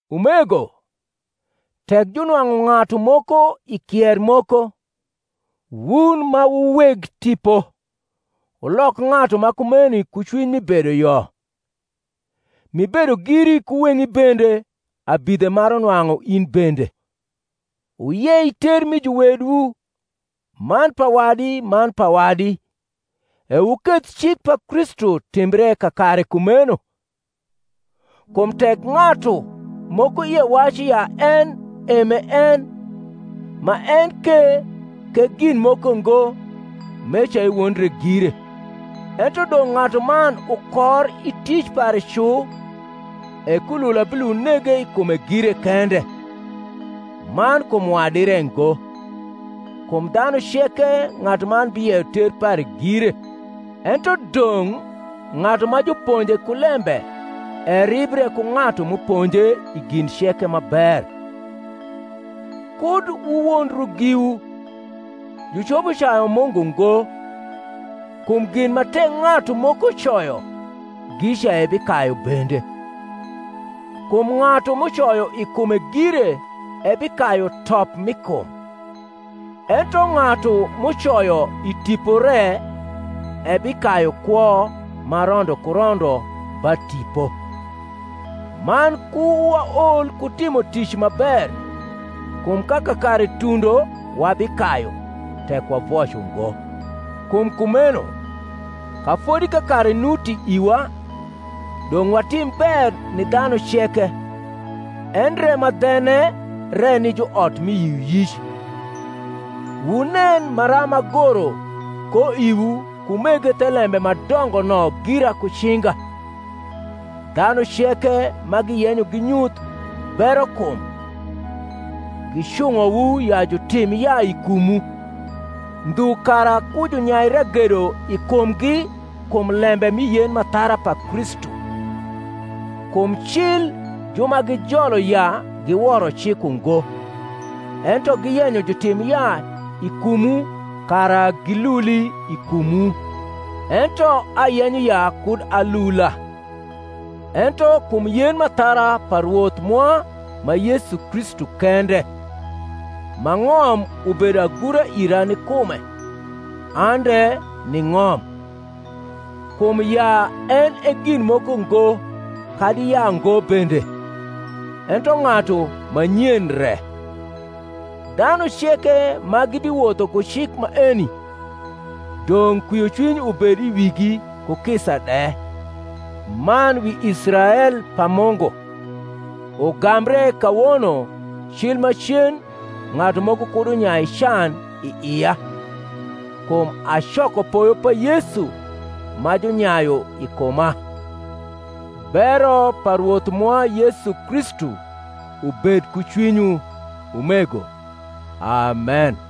Umego, tek junwang’u ng’atu moko i kier moko, wun ma wu weg tipo, wulok ng’atu ma kumeni ku cwiny mi bedoyo; m’ibedo giri ku weng’i bende, abidhe maru nwang’u in bende. Wuyei ter mi juwedwu man pa wadi man pa wadi, e wuketh cik pa Kristu timbre kakare kumeno. Kum tek ng’atu moko ie wacu ya en e m’e en, ma en ke k’e gin moko ngo, meca ewondre gire. Ento dong’ ng’atuman ukor i tic pare cu, e kulula bilund nege i kume gire kende, man kum wadi re ngo. Kum dhanu ceke ng’atuman biyeyo ter pare gire. Ento dong’ ng’atu ma juponje ku lembe eribre ku ng’atu m’uponje i gin ceke ma ber. Kud wuwondru giwu; jucopo cayu Mungu ngo: kum gin ma tek ng’atu moko coyo, gica ebikayu bende. Kum ng’atu m’ucoyo i kume gire ebikayu top mi kum; ento ng’atu m’ucoyo i Tipo re ebikayu kwo ma rondo ku rondp ba Tipo. Man ku waol ku timo tic ma ber: kum ka kakare tuudo wabikayu, tek wavoc ungo. Kum kumeno, ka fodi kakare nuti iwa, dong’ watim ber ni dhanu ceke, endre ma dhene re ni juot mi yioyic. Wunen maram agoro ko iwu ku mege thelembe ma dongo no gira ku cinga. Dhanu ceke ma giyenyo ginyuth berokum, gicung’owu ya jutim yaa i kumwu; ndhu kara ku junyai ragedo i kumgi kum lembe mi yen m’athara pa Kristu. Kum cil ju ma gijolo yaa giworo cik uugo; ento giyenyo jutim yaa i kumwu, kara giluli i kumwu. Ento ayenyo ya kud alula, ento kum yen m’athara pa Rwoth mwa ma Yesu Kristu kende, ma ng’om ubedo agura ira ni kume, an de ni ng’om. Kum yaa en e gin moko ngo, kadi yaango bende, ento ng’atu ma nyen re. Dhanu ceke ma gibiwotho ku cik maeni, dong’ kwiocwiny ubed i wigi, ku kisa de, man wi Israel pa Mungu. Ugambre kawono cil macen ng’atu moko kud unyai can i ia; kum acoko poyo pa Yesu ma junyayu i kuma. Bero pa Rwoth mwa Yesu Kristu ubed ku cwinywu, umego. Amen.